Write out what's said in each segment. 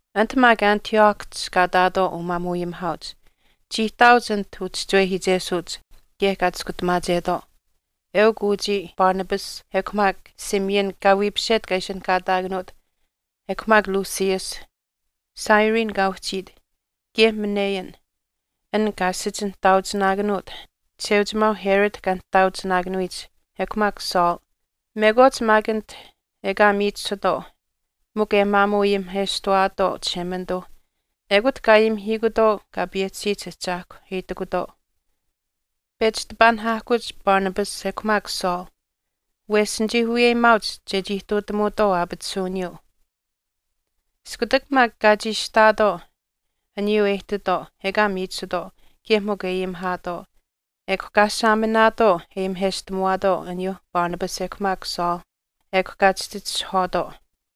Anit maak Antiochihch kaa ihtaatwaau umaamuuayimihaauch chii ihtaauch anit uchischiwehiichesuuch kaye kaa chiskutamaachetwaau. Eukw uchii, Barnabas ekw maak Simeon kaa wiipiset kaa ishinihkaataakanuut ekw maak Lucius, Cyrene kaa uhchiit, kaye Manaen an kaa asich nihtaauchinaakanuut Chisheuchimaau Herod kaa nihtaauchinaakanuyich ekw maak Saul. Mekwaach maak anit ekaa miichisutwaau mikw e maamuu ayimiheshtawaatwaau Chishemanituu, ekut kaa ayimihiikutwaau Kaa payehchisiyich Ahchaahkwa e itikutwaau, “Pechi tipaanihaahkuch Barnabas ekw maak Saul wesh nichii wiyeyimaauch chechii ihtuutamuutwaau aapatisuwiniyuu.” Iskutak maak kaa chiishihtaatwaau aniyuu e ihtitwaau ekaa miichisutwaau kaye mikw e ayimihaatwaau, ekw kaa saaminaatwaau e ayimiheshtamuwaatwaau aniyuu Barnabas ekw maak Saul, ekw kaa chihchitishahwaatwaau.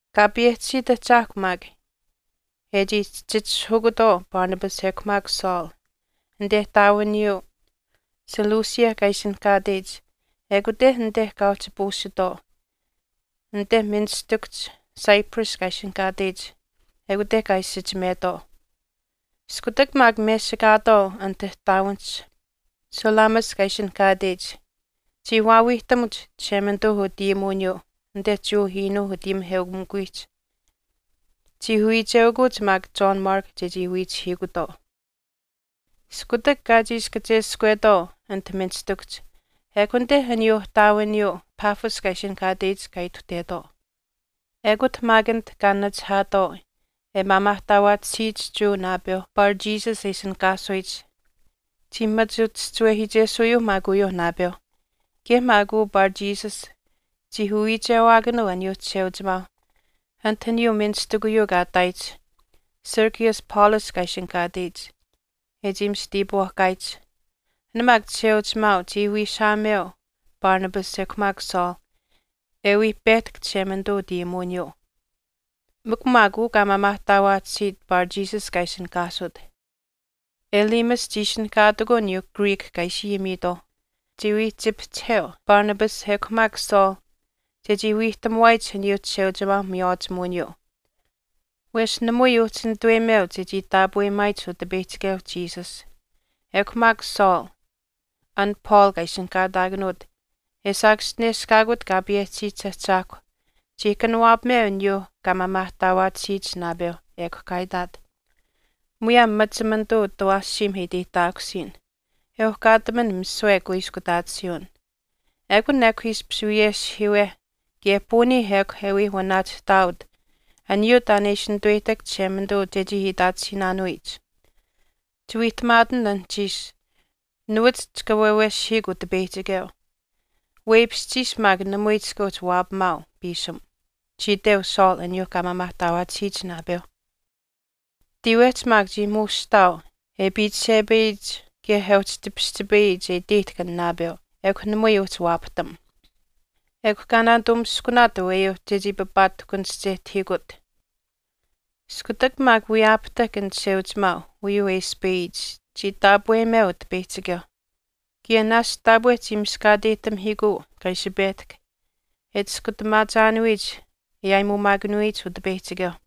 Kaa payehchisiit Ahchaahkw maak e chii chihchitishahukutwaau Barnabas ekw maak Saul anite ihtaawiniyuu Seleucia kaa ishinihkaateyich ekute anite kaa uhchi puusitwaau anite ministikuhch Cyprus kaa ishinihkaateyich ekute kaa isichimetwaau. Iskutak maak mesikaatwaau anit ihtaawinihch Salamis kaa ishinihkaateyich, chii waawiihtamuch Chishemanituu utayimuwiniyuu anite Jewa iinuuh utayimiheukamikuwiihch. Chii wiicheukuuch maak John Mark chechii wiichihiikutwaau. Iskutak kaa chiishi kacheskwetwaau anit ministikuhch ekw anite aniyuu ihtaawiniyuu Paphos kaa e ishinihkaateyich kaa ituhtetwaau. Ekut maak anit kaa nachihaatwaau e maamaahtaawaatisiyich Jewa naapeu Bar Jesus e ishinihkaasuyich, chii machi uchischiwehiichesuuyuu maak uyuu naapeu. Kaye maak uu Bar Jesus chii uwiichewaakanuu aniyuu Chisheuchimaau anit aniyuu ministikuyuu kaa ihtaayich, Sergius Paulus kaa ishinihkaasuyich, e chii mista iipwaahkaayich. An maak Chisheuchimaau chii wiishaameu Barnabas ekw maak Saul e wii pehtahk Chishemanituu utayimuwiniyuu. Mikw maak uu kaa maamaahtaawaatisiit Bar Jesus kaa ishinihkaasut, Elymas chii ishinihkaatikuu aniyuu Greek kaa ishi ayimiitwaau, chiwii chipihchiheu Barnabas ekw maak Saul chechii wiihtamuwaayich aniyuu Chisheuchimaau miywaachimuwiniyuu, wesh namui uhchi nituweyimeu chechii taapweyimaayich Utipeyihchikeu Jesus. Ekw maak Saul, an Paul kaa ishinihkaataakanuut e saakaschineshkaakut Kaa payehchisiyich Ahchaahkwa, chii kanawaapameu aniyuu kaa maamaahtaawaatisiyich naapeu, ekw kaa itaat, “Muyaam machimanituu utawaashiim e iteyihtaakusiyin, e uhkaataman misiwe kuiskutaatisiiwin. Ekun ekw ishpish wiyeshihiiwe kaye puunii ekw e wii wanaachihtaawat aniyuu taan e ishi nituweyihtahk Chishemanituu chechii itaatisiinaanuyich. Chiwiihtamaatin anuhchiish nuwach chika waaweshihiikw Utipeyihchikeu, weipishchiish maak namui chika uhchi waapamaau piisim,” chii iteu Saul aniyuu kaa maamaahtaawaatisiyich naapeu. Tiiwehch maak chii muushihtaau e piichishepayiyich kaye e uhchi tipischipayiyich e iteyihtahk an naapeu ekw namui uhchi waapahtam, ekw kaa naanitumiskunaat aweyuu chechii papaatahkunischehtahiikut. Iskutak maak wiyaapahtahk an chisheuchimaau uyuu e ispayiyich chii taapweyimeu Utipeyihchikeu kaye naashch taapwe chii miskaateyihtamihiikuu kaa ishi pehtahk e chiskutamaachaanuyich e aayimuumaakanuyich Utipeyihchikeu.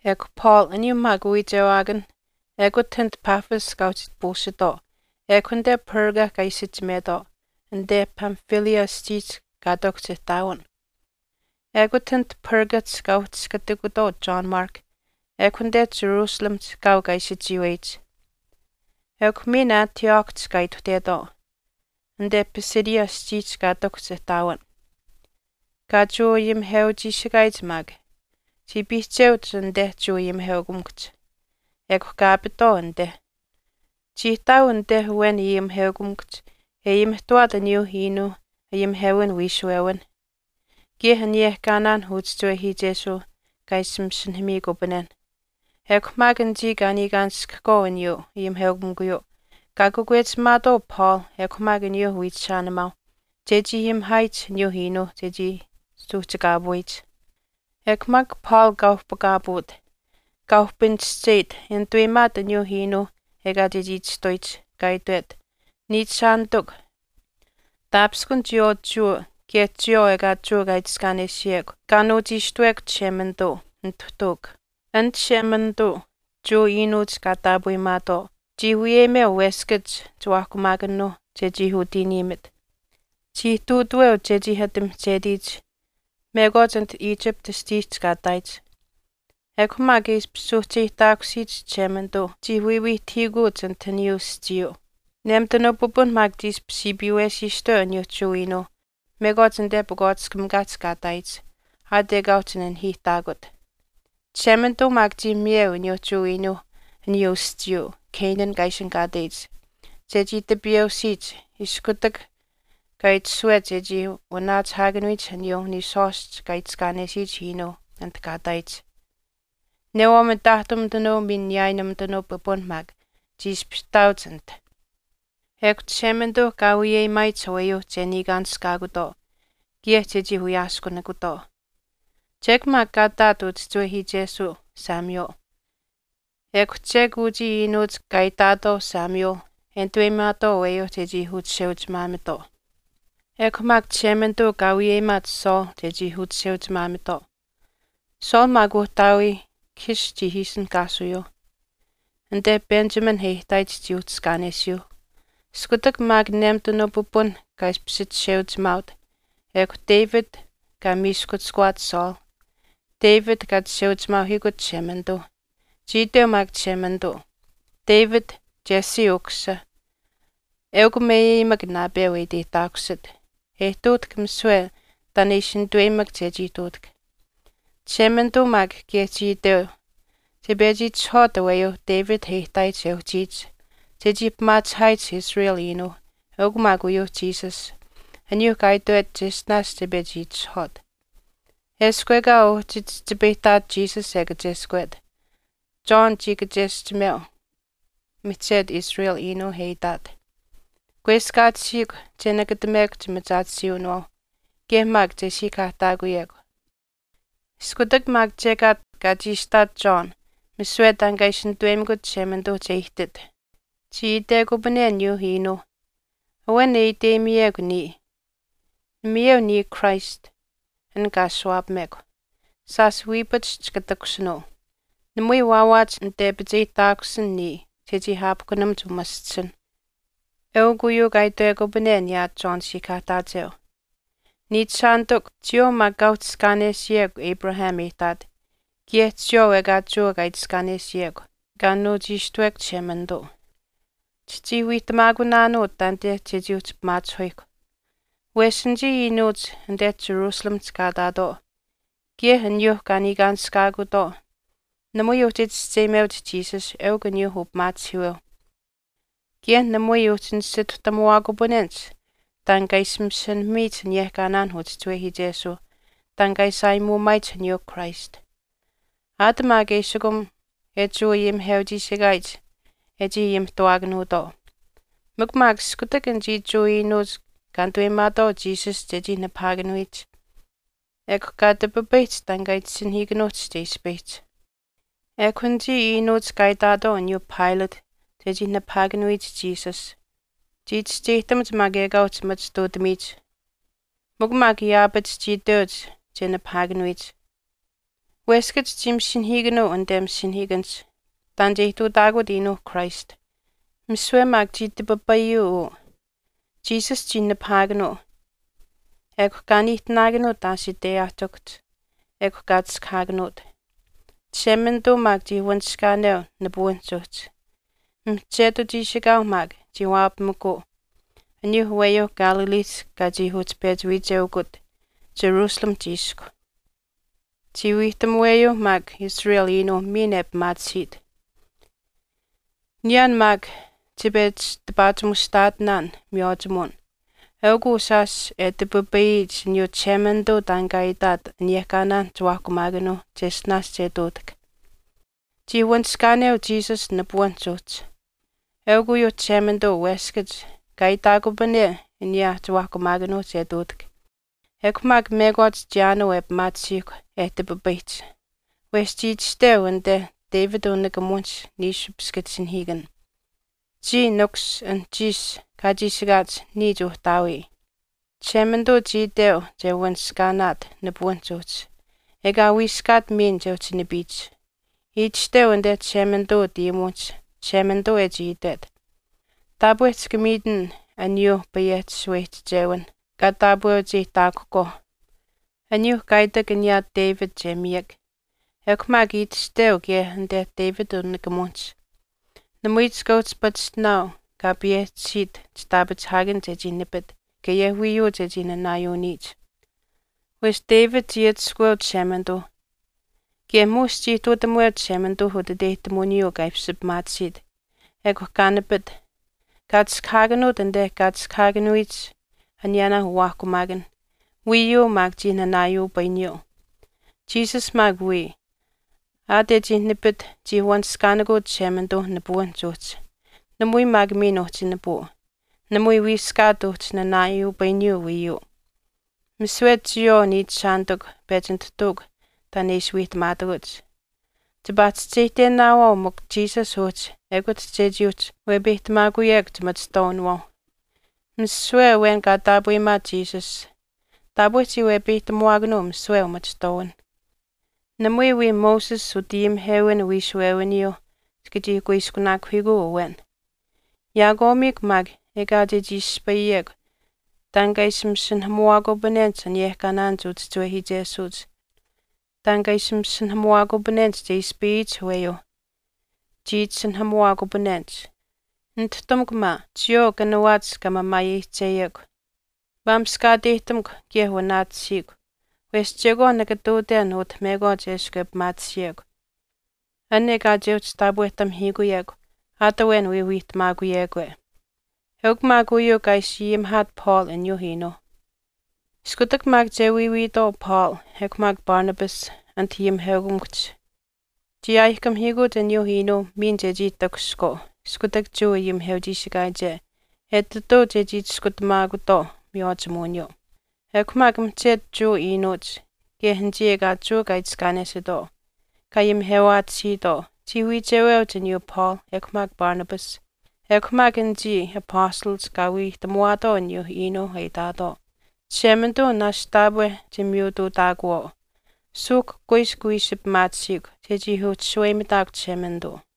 Ekw Paul aniyuu maak uwiichewaakanh ekut anit Paphos kaa uhchi puusitwaau, ekw anite Perga kaa isichimetwaau anite Pamphylia aschiihch kaa ihtakuhch ihtaawin. Ekut anit Pergahch kaa uhchiskatikutwaau John Mark ekw anite Jerusalemihch kaau kaa ishi chiiweyich. Ekw miin Antiochihch kaa ituhtetwaau anite Pisidia aschiihch kaa ihtakuhch ihtaawin. Kaa Jewa ayimiheuchiishikaayich maak chii piihcheuch anite Jewa ayimiheukamikuhch, ekw kaa apitwaau anite. Chii ihtaau anite awen ayimiheukamikuhch e ayimihtuwaat aniyuu iinuu ayimihewin wiishuwewinh, kaye aniyehkaanaan uchischiwehiichesuuh kaa ishi masinahamiikupanenh. Ekw maak anichii kaa niikaanishkahkwaau aniyuu ayimiheukamikuyuu kaa kakwechimaatwaau Paul ekw maak aniyuu wiichishaanimaauh chechii ayimihaayich aniyuu iinuu chechii suuhchikaapuyich. Ekw maak Paul kaa uhpakaapuut, kaa uhpinischeyit e nituweyimaat aniyuu iinuu ekaa chechii chistuyich, kaa itwet, “Niichishaanitikw, taapishkun chiyawaau Jewa kaye chiyawaau ekaa Jewa kaa itiskaanesiyekw kaa nuuchiishtuwekw Chishemanituu, nituhtuukw. An Chishemanituu, Jewa iinuuch kaa taapweyimaatwaau chii wiyeyimeu weskach chiwaahkumaakanuuh chechii utiiniimit. Chii ihtuutaweu chechii ati mihchetiyich mekwaach anit Egypt aschiihch kaa ihtaayich. Ekw maak e ishpish suuhcheyihtaakusiyich Chishemanituu chii wiiwiihtahiikuuch anit aschiihch uhchi. Nemitanuu pipun maak chii ishpish siipiiwesiistuweu aniyuu Jewa iinuuh mekwaach anite pakwaatiskamikaahch kaa ihtaayich aat ekaa uhchi nanihiihtaakut. Chishemanituu maak chii miyeu aniyuu Jewa iinuu aniyuu aschiiyuu Canaan kaa ishinihkaateyich chechii tipiyeusiyich iskutak kaa itashuwet chechii wanaachihaakanuyich aniyuu niishwaashch kaa itiskaanesiyich iinuuh anit kaa ihtaayich. Newaau mitaahtumitanuu miin niyaayinumitanuu pipun maak chii ishpish ihtaauch anit.” “Ekw Chishemanituu kaa wiyeyimaayich aweyuuh che niikaanishkaakutwaau kaye chechii wiyaaskunikutwaau. Chek maak kaa ihtaat uchischiwehiichesuu Samuel. Ekw chek uchii iinuuch kaa itaatwaau Samuel e nituweyimaatwaau aweyuu che uchisheuchimaamitwaau. Ekw maak Chishemanituu kaa wiyeyimaat Saul chechii uchisheuchimaamitwaau. Saul maak uhtaawii Kish chii ishinihkaasuyuuh, anite Benjamin e ihtaayich chii uhchiskaanesiyuu. Iskutak maak nemitanuu pipun kaa ishpish chisheuchimaaut, ekw David kaa miiskuchishkuwaat Saul, David kaa chisheuchimaauhiikut Chishemanituu. Chii iteu maak Chishemanituu, David, Jesse ukusisa, eukw meyeyimak naapeu e iteyihtaakusit e ihtuutahk misiwe taan e ishi nituweyimak chechii ihtuutahk. Chishemanituu maak kaye chii itweu che pechi itishahwaat aweyuu David e ihtaayich e uhchiyich chechii pimaachihaat Israel iinuuh eukw maak uyuu Jesus, aniyuu kaa itwet cheshtinaash che pechi itishahwaat. Eshkw ekaa uhchi chihchipayihtaat Jesus e kacheskwet, John chii kacheschimeu mihchetu Israel iinuuh e itaat, Kweskaatisiikw che nakatamekw chimachaatisiiwinawaauh, kaye maak che siikahaahtaakuyekw. Iskutak maak chekaat kaa chiishihtaat John misiwe taan kaa ishi nituweyimikut Chishemanituu che ihtit, chii itekupane aniyuu iinuu, ‘Awen e iteyimiyekw niya. Namayeu niya Christ an kaa ashuwaapamekw. Shaash wiipach chika takushinuu, namui waawaach nitepicheyihtaakusin niya chechii aapahkunamuch umaschisinh.’ Eukw uyuu kaa itwekupane aniyaa John siikahaahtaacheu.” “Niichishaanitikw, chiyawaau maak kaa uhchiskaanesiyekw Abraham e ihtaat kaye chiyawaau ekaa Jewa kaa itiskaanesiyekw kaa nuuchiishtuwekw Chishemanituu, chichii wiihtamaakunaanuu taanite chechii uhchi pimaachihuyihkw. Wesh anichii iinuuch anite Jerusalemihch kaa ihtaatwaau kaye aniyuu kaa niikaanishkaakutwaau namui uhchi chischeyimeuch Jesus eukw aniyuu upimaachihiiweu, kaye namui uhchi nisituhtamuwaakupanenich taan kaa ishi masinahamiyich aniyehkaanaan uchischiwehiichesuuh taan kaa ishi aayimuumaayich aniyuu Christ. Aat maak eshikum e Jewa ayimiheuchiishikaayich e chii ayimihtuwaakanuutwaau. Mikw maak iskutak anichii Jewa iinuuch kaa nituweyimaatwaau Jesus chechii nipahaakanuyich, ekw kaa tipipayihch taan kaa itasinahiikanuuhch che ispayihch. Ekw anichii iinuuch kaa itaatwaau aniyuu Pilate chechii nipahaakanuyich Jesus, chii chischeyihtamuch maak ekaa uhchi machituutamiyich mikw maak yaapach chii iteuch che nipahaakanuyich. Weskach chii masinahiikanuu anite masinahiikanihch taan che ihtuutaakut iinuuh Christ, misiwe maak chii tipipayuu uyuu, Jesus chii nipahaakanuu ekw kaa niihtinaakanuut aashiteyaahtikuhch, ekw kaa chiskahaakanuut. Chishemanituu maak chii wanishkaaneu nipuwinihch uhchi. Mihchetu chiishikaau maak chii waapamikuu aniyuuh aweyuuh Galileehch kaa chii uhchi pechi wiicheukut Jerusalemihch iisku. Chii wiihtamuweyuu maak Israel iinuu miin e pimaatisiit.” “Niyaan maak chipechi tipaachimushtaatinaan miywaachimuwin eukw uu shaash e tipipayiyich aniyuu Chishemanituu taan kaa itaat aniyehkaanaan chiwaahkumaakanuu cheshtinaash che ihtuutahk. Chii wanishkaaneu Jesus nipuwinihch uhchi. Eukw uyuu Chishemanituu weskach kaa itaakupane aniyaa chiwaahkumaakanuuh che ihtuutahk, ekw maak mekwaach chiyaanuu e pimaatisiihkw e tipipayihch. Wesh chii itashteu anite David unikamuwinihch niishu piskitisinahiikan, Chiya Nikus, anuhchiish kaa chiishikaach niya Chuuhtaawii. Chishemanituu chii iteu che wanishikaanaat nipuwinihch uhchi, ekaa wiiskaat miin che uhchi nipiyich. Itashteu anite Chishemanituu utayimuwinihch Chishemanituu e chii itwet, Taapwe chika miitin aniyuuh payehchi shaweyihchichewinh kaa taapweucheyihtaakuhkwaauh aniyuu kaa itak aniyaa David che miyak. Ekw maak itashteu kaye anite David unikamuwinihch, Namui chika uhchi pachishtinaau kaa payehchisiit chitaapachihaakan chechii nipit, kaye wiiyuu chechii nanaayuuniyich. Wesh David chii atushkuweu Chishemanituu kaye muush chii ihtuutamuweu Chishemanituu utiteyihtamuwiniyuu kaa ishpish pimaatisiit. Ekw kaa nipit, kaa chiskahaakanuut anite kaa chiskahaakanuyich aniyaanaa uwaahkumaakan, wiiyuu maak chii nanaayuupayiniyuu. Jesus maak wiya, aat e chii nipit chii wanishkaanikuu Chishemanituu nipuwinihch uhchi, namui maak miin uhchi nipuu, namui wiiskaat uhchi nanaayuupayiniyuu wiiyuu. Misiwe chiyawaau niichishaanitikw pechi nituhtuukw taan e ishi wiihtamaatakuch, chipaa chischeyihtenaawaau mikw Jesus uhchi ekut chechii uhchi wepeyihtamaakuyekw chimachihtwaawinawaau. Misiwe awen kaa taapweyimaat Jesus taapwe chii wepeyihtamuwaakanuu misiwe umachihtwaawinh, namui wii Moses utayimihewin wiishuwewiniyuuh chika chii kuiskunaakuhiikuu awen. Yaakwaamiikw maak ekaa chechii ispayiyekw taan kaa ishi masinahamuwaakupanenich aniyehkaanaanich uchischiwehiichesuuch taan kaa ishi masinahamuwaakupanenich che ispayiyich aweyuu, chii itasinahamuwaakupanenich, Nituhtamukw maa, chiyawaau kanawaach kaa mamaayeyihcheyekw, maamishkaateyihtamukw kaye wanaatisiikw. Wesh chekwaan nika ihtuuten utah mekwaach eshkw e pimaatisiyekw an ekaa che uhchi taapwehtamihiikuyekw aat awen wii wiihtamaakuyekwe.” Eukw maak uyuu kaa ishi ayimihaat Paul aniyuu iinuuh. Iskutak maak che wiiwiitwaau Paul ekw maak Barnabas anit ayimiheukamikuhch chii aayihkamihiikuuch aniyuu iinuuh miin chechii takushihkwaau iskutak Jewa ayimiheuchiishikaayiche etituu chechii chiskutamaakutwaau miywaachimuwiniyuu. Ekw maak mihchetu Jewa iinuuch kaye anichii ekaa Jewa kaa itiskaanesitwaau kaa ayimihewaatisiitwaau chii wiicheweuch aniyuu Paul ekw maak Barnabas. Ekw maak anichii apastalach kaa wiihtamuwaatwaau aniyuu iinuu e itaatwaau, Chishemanituu naashch taapwe chimiyutuutaakuwaau, suuhk kuiskw wii ishi pimaatisiikw chechii uhchi shaweyimitaakw Chishemanituu.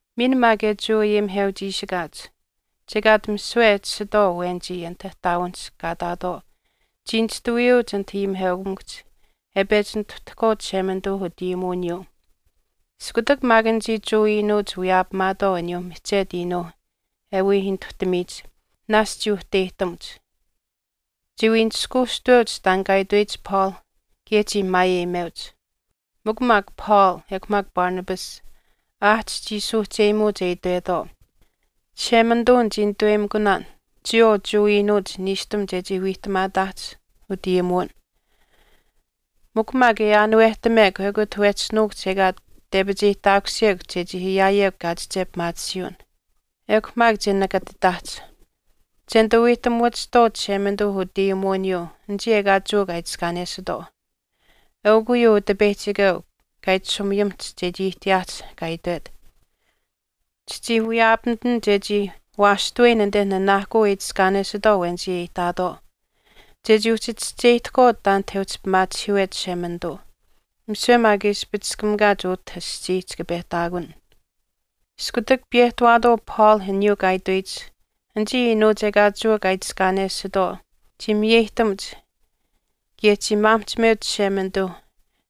Miin maak e Jewa ayimiheuchiishikaach, chekaat misiwe e tashitwaau awenichii anit ihtaawinihch kaa ihtaatwaau chii nishtuwiyuuch anit ayimiheukamikuhch e pechi nituhtahkwaau Chishemanituu utayimuwiniyuu. Iskutak maak anichii Jewa iinuuch wiyaapamaatwaau aniyuu mihchetu iinuu e wii nituhtamiyich, naashch chii uhteyihtamuch. Chiwii nishkuushtuweuch taan kaa itweyich Paul kaye chii maayeyimeuch. Mikw maak Paul ekw maak Barnabas aahch chii suuhcheyimuuch e itwetwaau, “Chishemanituu nichii nituweyimikunaan chiyawaau Jewa iinuuch niishtam chechii wiihtamaataahch utayimuwin. Mikw maak e aanuwehtamekw ekut wehchi nuukuhch ekaa tepicheyihtaakusiyekw chechii ayaayekw kaachiche pimaatisiiwin. Ekw maak che nakatitaahch, che nituu wiihtamuwachihtwaau Chishemanituu utayimuwiniyuu anichii ekaa Jewa kaa itiskaanesitwaau. Eukw uyuu Utipeyihchikeu kaa itashumiyimiht chechii ihtiyaahch kaa itwet, Chichii wiyaapamitin chechii waashtuweyin anite nanaahkuu e itiskaanesitwaau awenichii e ihtaatwaau, chechii uhchi chischeyihtahkwaau taanit e uhchi pimaachihiiwet Chishemanituu. Misiwe maak e ispichiskamikaach utah aschii chika pehtaakun.” Iskutak piyehtawaatwaau Paul aniyuu kaa itweyich anichii iinuuch ekaa Jewa kaa itiskaanesitwaau nuwach chii miyeyihtamuch kaye chii maamihchimeuch Chishemanituu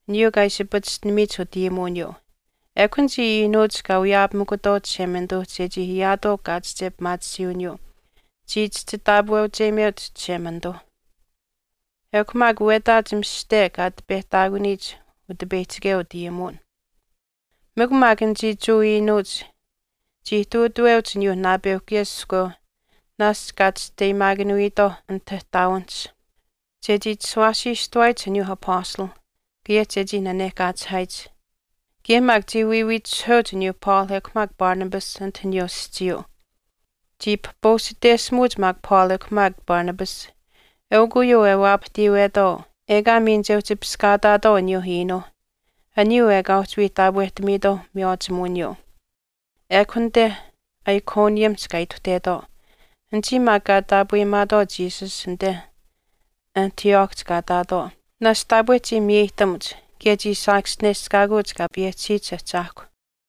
aniyuu kaa ishi pachishtinamiyich utayimuwiniyuu. Ekw anichii iinuuch kaa wiyaapamikutwaau Chishemanituu chechii ayaatwaau kaachiche pimaatisiiwiniyuu chii chihchi taapweyimeuch Chishemanituu. Ekw maak wetaach mishihte kaa ati pehtaakuniyich Utipeyihchikeu utayimuwin. Mikw maak anichii Jewa iinuuch chii ihtuutaweuch aniyuu naapeu kaye iskweu naashch kaa chisteyimaakanuyitwaau anit ihtaawinihch chechii chishuwaasiistuwaayich aniyuu apastalh kaye chechii nanehkaachihaayich. Kaye maak chii wiiwiitishihuweuch aniyuu Paul ekw maak Barnabas anit aniyuu aschiiyuu. Chii pahpuusiteshimuuch maak Paul ekw maak Barnabas. Eukw uyuu e waapahtiiwetwaau ekaa miin che uhchi piskaataatwaau aniyuu iinuu aniyuu ekaa uhchi wii taapwehtamiitwaau miywaachimuwiniyuu. Ekw anite Iconiumihch kaa ituhtetwaau. Anichii maak kaa taapweyimaatwaau Jesus anite Antiochihch kaa ihtaatwaau naashch taapwe chii miyeyihtamuch kaye chii saakaschineshkaakuuch Kaa payehchisiyich Ahchaahkwa.